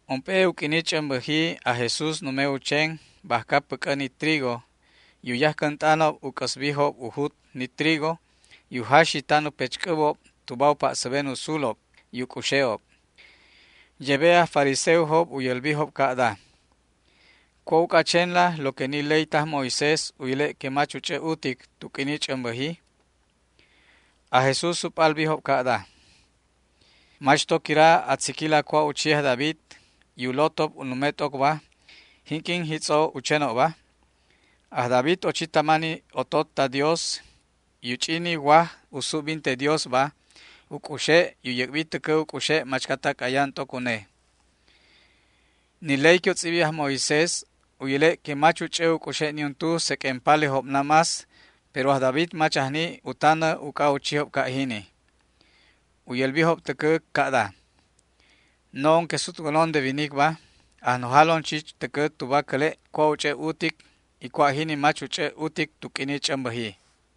Ump'e u q'uini ch'ämbäji aj Jesús nume u chen bajca päc'ä ni trigo y u yajcänt'anob u c'äsbijob u jut ni trigo y u jaxi tan u pechc'äbob tuba u pa'säben u sulob y u c'uxe'ob. Yebe aj fariseojob u yälbijob ca'da: ―¿Cua' uc'a a chenla lo que ni ley taj Moisés u yäle' que mach u ch'ä utic tu q'uini ch'ämbäji? Aj Jesús u p'albijob ca'da: ―¿Mach to quira a tziquila cua' u chi aj David y u lotob u nume t'ocba, jinq'uin jitz'o u chenobba? Aj David ochi tama ni otot ta Dios y u ch'i ni waj u subbinte Diosba u c'uxe' y u yäc'bi täcä u c'uxe' machcatac ayan t'oc une. Ni ley que u tz'ibi aj Moisés u yäle' que mach u ch'ä u c'uxe' niuntu seq'uen palejob namás, pero aj David mach ajni u tanä uc'a u chijob ca' jini. U yälbijob täcä ca'da: ―No'on que sutwänon de winicba ajnojalon chich täcä tuba cäle' cua' u ch'e' utic y cua' jini mach u ch'ä utic tu q'uini ch'ämbäji.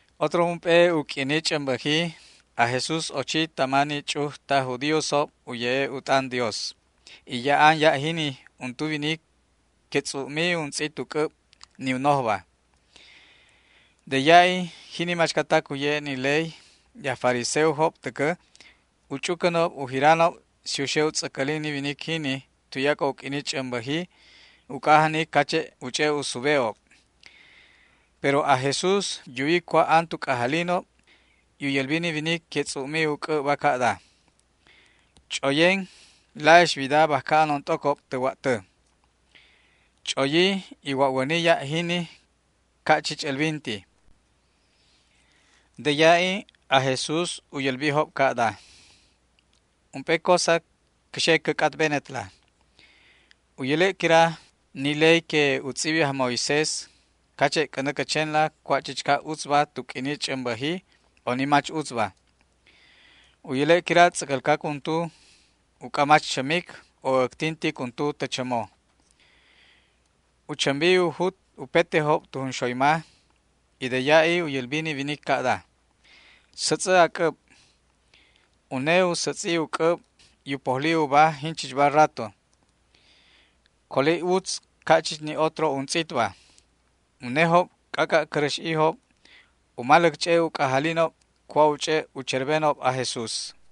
Otro ump'e u q'uini ch'ämbäjiba aj Jesús ochi tama ni ch'uj taj judíosob u ye'e' u t'an Dios, y ya'an ya' jini untu winic que tz'u'mi untz'it u c'äb, ni u nojba. De ya'i jini machcatac u ye'e' ni ley y aj fariseojob täcä u ch'ucänob u jiranob si u xe u tz'äcälin ni winic jini tuyac'o u q'uini ch'ämbäji, uc'a ajnic cache' u ch'e' u sube'ob. Pero aj Jesús yuwi cua' an tu c'ajalinob y u yälbi ni winic que tz'u'mi u c'äbba ca'da: ―Ch'oyen, la'ix wida bajca anon t'ocob tä wa'tä. Ch'oyi y wa'wäni ya' jini ca' chich älbinti. De ya'i aj Jesús u yälbijob ca'da: ―Ump'e cosa cä xe cä c'atbenetla. ¿U yäle' quira ni ley que u tz'ibi aj Moisés cache' c'änä cä chenla cua' chichca utzba tu q'uini ch'ämbäji, o ni mach utzba? ¿U yäle' quira tz'äcälcac untu uc'a mach chämic, o äctintic untu tä chämo? U chämbi u jut upetejob tu junxoyma, y de ya'i u yälbi ni winic ca'da: ―Sätz'ä a c'äb. Une u sätz'i u c'äb y u pojli uba jinchichba rato. Coli utz ca' chich ni otro untz'itba. Unejob c'ac'a' cäräx'ijob u maläc ch'e' u c'ajalinob cua' u ch'e' u cherbenob aj Jesús.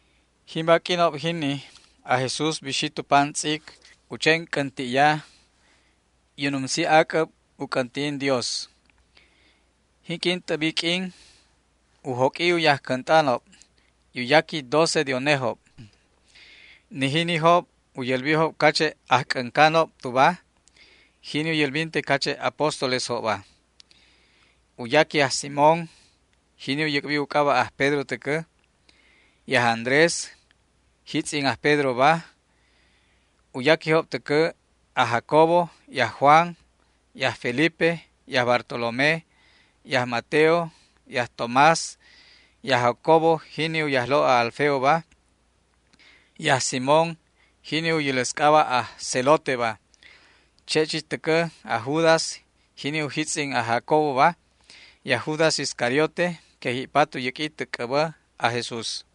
Jimba q'uinob jini aj Jesús bixi tu pam tz'ic u chen c'änti'ya, y u numsi ac'äb u c'änti'in Dios. Jinq'uin t'äbi q'uin u joq'ui u yajcänt'anob, y u yaqui doce de unejob. Ni jinijob u yälbijob cache' ajc'äncanob tuba, jini u yälbinte cache' apóstolesjobba. U yaqui aj Simón, jini u yäc'bi u c'aba' aj Pedro täcä; y aj Andrés, jitz'in aj Pedroba. U yaquijob täcä aj Jacobo y aj Juan, y aj Felipe, y aj Bartolomé, y aj Mateo, y aj Tomás, y aj Jacobo jini u yajlo' aj Alfeoba, y aj Simón jini u yäläs c'aba' aj Zeloteba. Che' chich täcä aj Judas jini u jitz'in aj Jacoboba, y aj Judas Iscariote que ji'pat u yäq'ui tä c'äbä aj Jesúsba.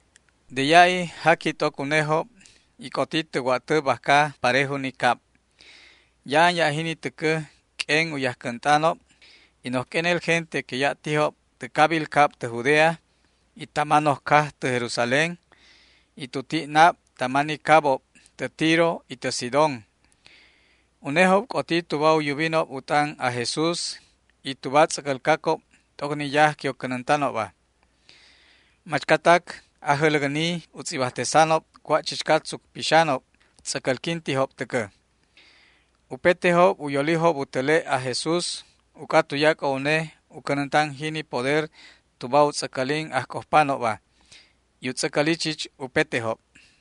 De ya'i jaqui t'oc unejob y c'oti tä wa'tä bajca parejo ni cab. Ya'an ya' jini täcä q'uen u yajcänt'anob y noj q'uenel gente que ya' tijob tä cabil cab tä Judea, y tama noj caj tä Jerusalén, y tu ti' nab tama ni cabob tä Tiro y tä Sidón. Unejob c'oti tuba u yubinob u t'an aj Jesús y tuba tz'äcälcacob t'oc ni yaj que u cänäntanobba. Machcatac ajäläcni u tz'ibajtesanob cua' chichca tzuc pixanob tz'äcälquintijob täcä. Upetejob u yolijob u täle' aj Jesús uc'a tuyac'o une u cänäntan jini poder tuba u tz'äcälin ajc'ojpanobba, y u tz'äcäli chich upetejob.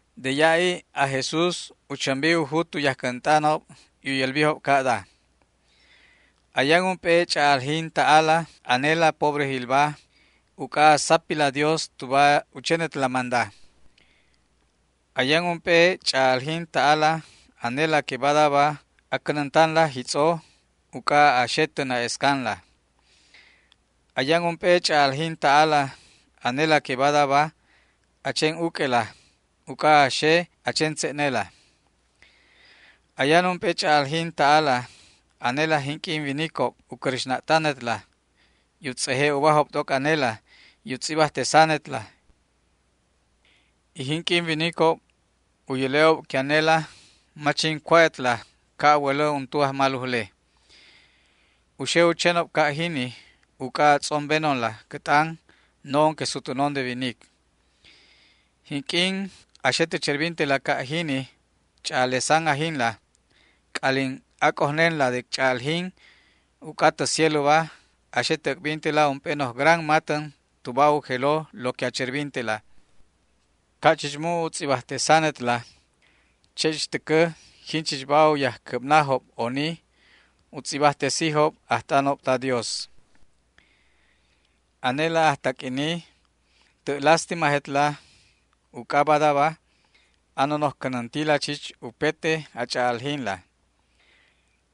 De ya'i aj Jesús u chämbi u jut u yajcänt'anob y u yälbijob ca'da: ―Ayan ump'e ch'a'aljin ta'ala anela pobrejilba uc'a a sapila Dios tuba u chenetla manda. ’Ayan ump'e ch'a'aljin ta'ala anela que badaba a cänäntanla jitz'o uc'a a xe tä na'escanla. ’Ayan ump'e ch'a'aljin ta'ala anela que badaba a chen uq'uela uc'a a xe a chen tze'nela. ’Ayan ump'e ch'a'aljin ta'ala anela jinq'uin winicob u cräxna'tanetla y u tz'eje' ubajob t'oc anela y u tz'ibajtesanetla, y jinq'uin winicob u yäle'ob que anela mach jin cua'etla, ca' a wälä untu ajmalujle. U xe u chenob ca' jini uc'a a tz'ombenonla cä t'an no'on que sutwänon de winic. Jinq'uin a xe tä cherbintela ca' jini ch'a'alesan ajinla, c'alin ac'ojnenla de ch'a'aljin, uc'a tä cieloba a xe tä äc'bintela ump'e noj gran matän tuba u jelo lo que cherbintetla. Ca' chich mu' u tz'ibajtesanetla, che' chich täcä jinchichba u yajcäbnajob oni u tz'ibajtesijob ajt'anob ta Dios. ’Anela ajtaq'uini, tä' lástimajetla uc'a badaba a nonoj cänäntila chich upete a ch'a'aljinla.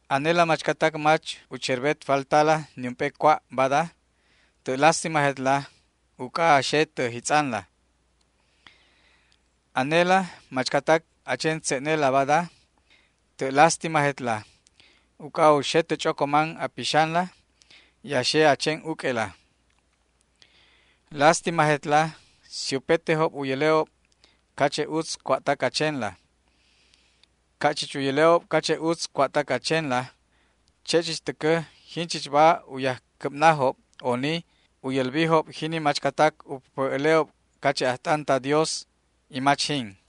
’Anela machcatac mach u cherbet faltala niump'e cua' bada, tä' lástimajetla uc'a a xe tä jitz'anla. ’Anela machcatac a chen tze'nela bada, tä' lástimajetla uc'a u xe tä ch'ocoman a pixanla y a xe a chen uq'uela. ’Lástimajetla si upetejob u yäle'ob cache' utz cua'tac a chenla. Ca' chich u yäle'ob cache' utz cua'tac a chenla, che' chich täcä jinchichba u yajcäbnajob oni u yälbijob jini machcatac u päpä' äle'ob cache' ajt'an ta Dios, y mach jin.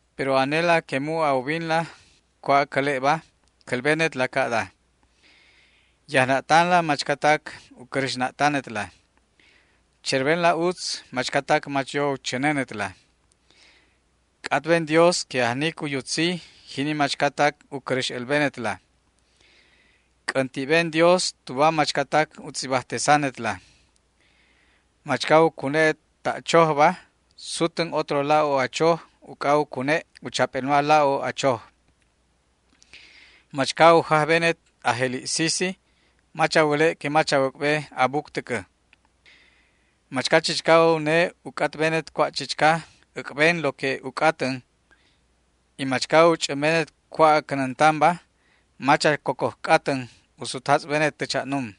’Pero anela que mu' a ubinla cua' acäle'ba cälbenetla ca'da: Yajna'tanla machcatac u cräxna'tanetla. Cherbenla utz machcatac mach yo u chänenetla. C'atben Dios que ajnic u yutzi jini machcatac u cäräx älbenetla. C'änti'ben Dios tuba machcatac u tz'ibajtesanetla. Machca u cune'et ta' chojba sutän otro la'o a choj uc'a u cune' u chap'elma la'o a choj. Machca u jajbenet a jeli' sisi mach a wäle' que mach a wäc'be a buc täcä. Machca chichca une u c'atbenet cua' chichca, äc'ben lo que u c'atän, y machca u ch'ämbenet cua' a cänäntanba, mach a cocoj c'atän u sutjatz'benet tä cha'num.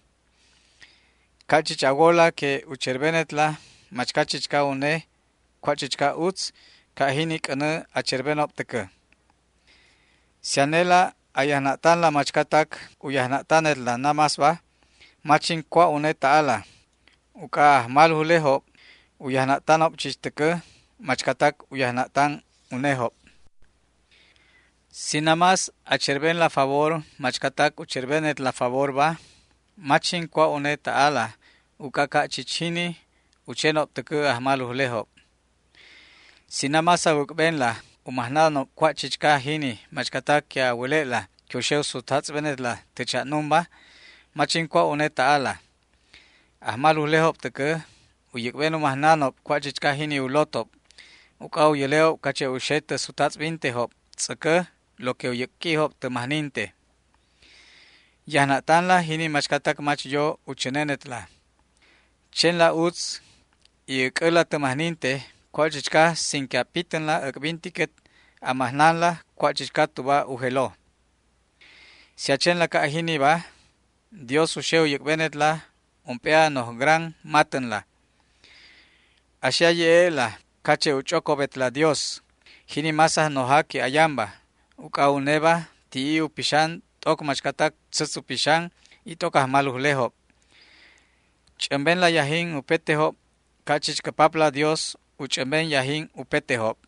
Ca' chich a wola que u cherbenetla machca chichca une cua' chichca utz, ca' jini c'änä a cherbenob täcä. ’Si anela a yajna'tanla machcatac u yajna'tanetla namásba mach jin cua' une ta'ala, uc'a ajmalujlejob u yajna'tanob chich täcä machcatac u yajna'tanob unejob. Si namás a cherbenla favor machcatac u cherbenetla favorba mach jin cua' une ta'ala, uc'a ca' chich jini u chenob täcä ajmalujlejob. Si namás a wäc'benla u majnanob cua' chichca jini machcatac que a wäle'la que u xe u sutjatz'benetla tä cha'numba, mach jin cua' une ta'ala. Ajmalujlejob täcä u yäc'ben u majnanob cua' chichca jini u lotob, uc'a u yäle'ob cache' u xe tä sutjatz'bintejob tz'äcä lo que u yäq'uijob tä majninte. Yajna'tanla jini machcatac mach yo u chänenetla. Chenla utz y äc'äla tä majninte cua' chichca sin que a pitänla äc'bintiquet a majnanla cua' chichca tuba u jelo. Si a chenla ca' jiniba Dios u xe u yäc'benetla ump'e a noj gran matänla. A xe a ye'e'la cache' u ch'ocobetla Dios, jini más Ajnoja que ayanba, uc'a uneba ti'i u pixan t'oc machcatac tzätz u pixan, y t'oc ajmalujlejob. Ch'ämbenla yajin upetejob ca' chich cä Papla Dios u ch'ämben yajin upetejob.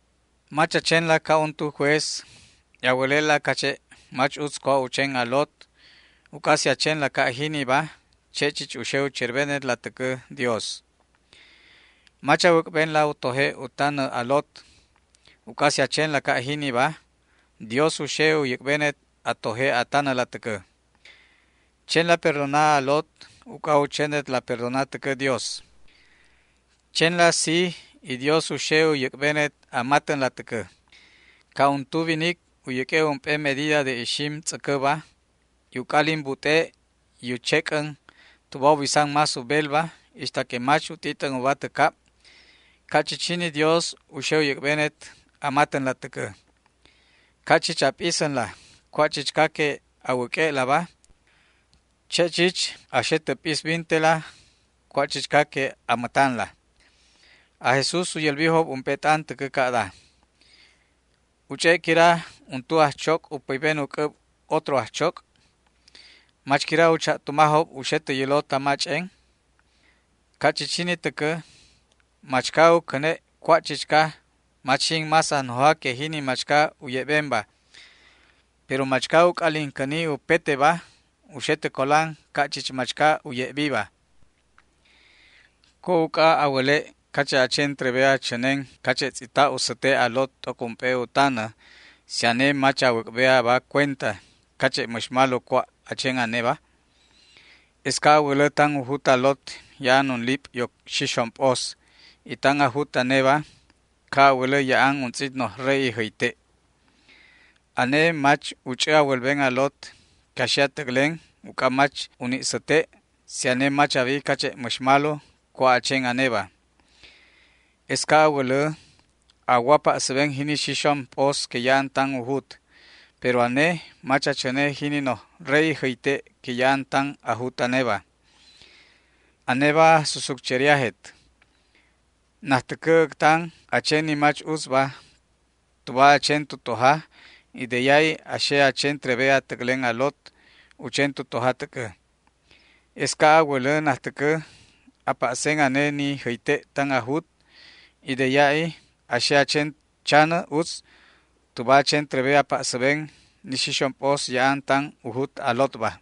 ’Mach a chenla ca' untu juez y a wäle'la cache' mach utz cua' u chen a lot, uc'a si a chenla ca' jiniba che' chich u xe u cherbenetla täcä Dios. Mach a wäc'benla u toje' u tanä a lot, uc'a si a chenla ca' jiniba Dios u xe u yäc'benet a toje' a tanäla täcä. Chenla perdona a lot uc'a u chenetla perdona täcä Dios. Chenla sij y Dios u xe u yäc'benet a matänla täcä. Ca' untu winic u yäq'ue' ump'e medida de ixim tz'äcäba y u c'alin but'e' y u chec'än tuba u bisan más u belba ixta que mach u t'it'än uba tä cab, ca' chich jini Dios u xe u yäc'benet a matänla täcä. Ca' chich a p'isänla cua' chichca que a wäq'ue'laba, che' chich a xe tä p'isbintela cua' chichca que a mätanla. Aj Jesús u yälbijob ump'e t'an täcä ca'da: ―¿U ch'e' quira untu ajchoc' u päyben u c'äb otro ajchoc'? ¿Mach quira u cha'tumajob u xe tä yälo tama ch'en? Ca' chich jini täcä, machca u cäne' cua' chichca mach jin más ajnoja que jini machca u ye'benba, pero machca u c'alin cäni upeteba u xe tä colan ca' chich machca u ye'biba. ’¿Cua' uc'a a wäle' cache' a chen trebe a chänen cache' tz'ita' u säte' a lot t'oc ump'e u tanä si ane mach a wäc'be aba cuenta cache' mäx malo cua' a chen aneba? Es ca' a wälä tan u jut a lot ya'an unlip' yoc xixom p'os, y tan a jut aneba ca' a wälä ya'an untz'it noj re'i jäyte'. Ane mach u ch'ä a wälben a lot que a xe a täclen uc'a mach u ni' säte' si ane mach a wi cache' mäx malo cua' a chen aneba. Es ca' a wälä a wo a pa'säben jini xixom p'os que ya'an tan u jut, pero ane mach a chäne jini noj re'i jäyte' que ya'an tan a jut aneba. ¡Aneba ajsusutcheriajet! Najtäcä äctan a chen ni mach utzba tuba a chen tu toja y de ya'i a xe a chen trebe a täclen a lot u chen tu toja täcä. Es ca' a wälä najtäcä a pa'sen ane ni jäyte' tan a jut y de ya'i a xe a chen chanä utz tuba a chen trebe a pa'säben ni xixom p'os ya'an tan u jut a lotba.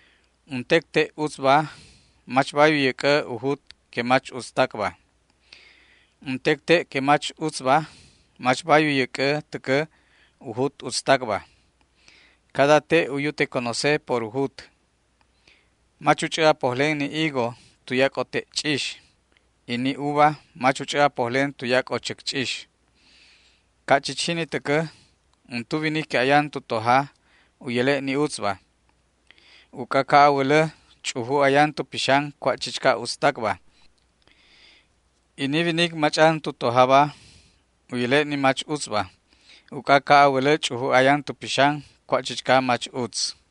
’Untec te' utzba mach bay u yäc'ä u jut que mach utztacba, y untec te' que mach utzba mach bay u yäc'ä täcä u jut utztacba. Cada te' u yute conoce por u jut. Mach u ch'ä a pojlen ni higo tuyac'o te' ch'ix, y ni uva mach u ch'ä a pojlen tuyac'o chäcch'ix. Ca' chich jini täcä, untu winic que ayan tu toja u yäle' ni utzba, uc'a ca' a wälä ch'uju ayan tu pixan cua' chichca utztacba, y ni winic mach'an tu tojaba u yäle' ni mach utzba, uc'a ca' a wälä ch'uju ayan tu pixan cua' chichca mach utz.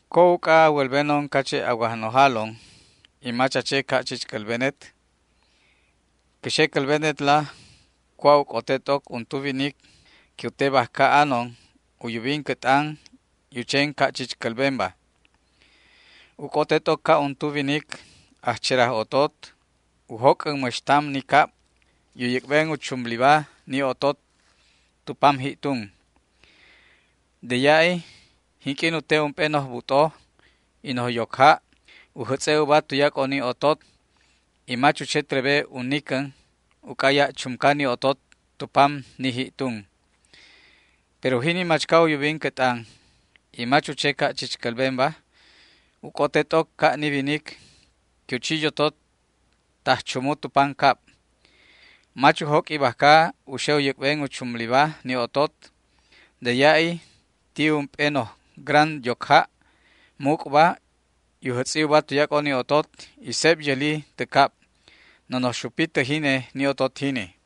’¿Cua' uc'a a wälbenon cache' a wajnojalon y mach a che ca' chich cälbenet? Cä xe cälbenetla cua' u c'ote t'oc untu winic que u te bajca anon u yubin cä t'an y u chen ca' chich cälbenba. U c'ote t'oc ca' untu winic ajcheraj otot u joc'än mäx tam ni cab y u yäc'ben u chumliba ni otot tu pam ji'tun. De ya'i jinq'uin u te ump'e noj but'o y noj yocja' u jätz'e' uba tuyac'o ni otot y mach u che trebe u nicän, uc'a ya' chumca ni otot tu pam ni ji'tun. Pero jini machca u yubin cä t'an y mach u che ca' chich cälbenba u c'ote t'oc ca' ni winic que u chi yotot taj chumu tu pancab. Mach u jóq'ui bajca u xe u yäc'ben u chumliba ni otot. De ya'i ti ump'e noj gran yocja' muc'ba y u jätz'i uba tuyac'o ni otot y seb yäli tä cab. Nonoj xupi tä jine ni otot jini.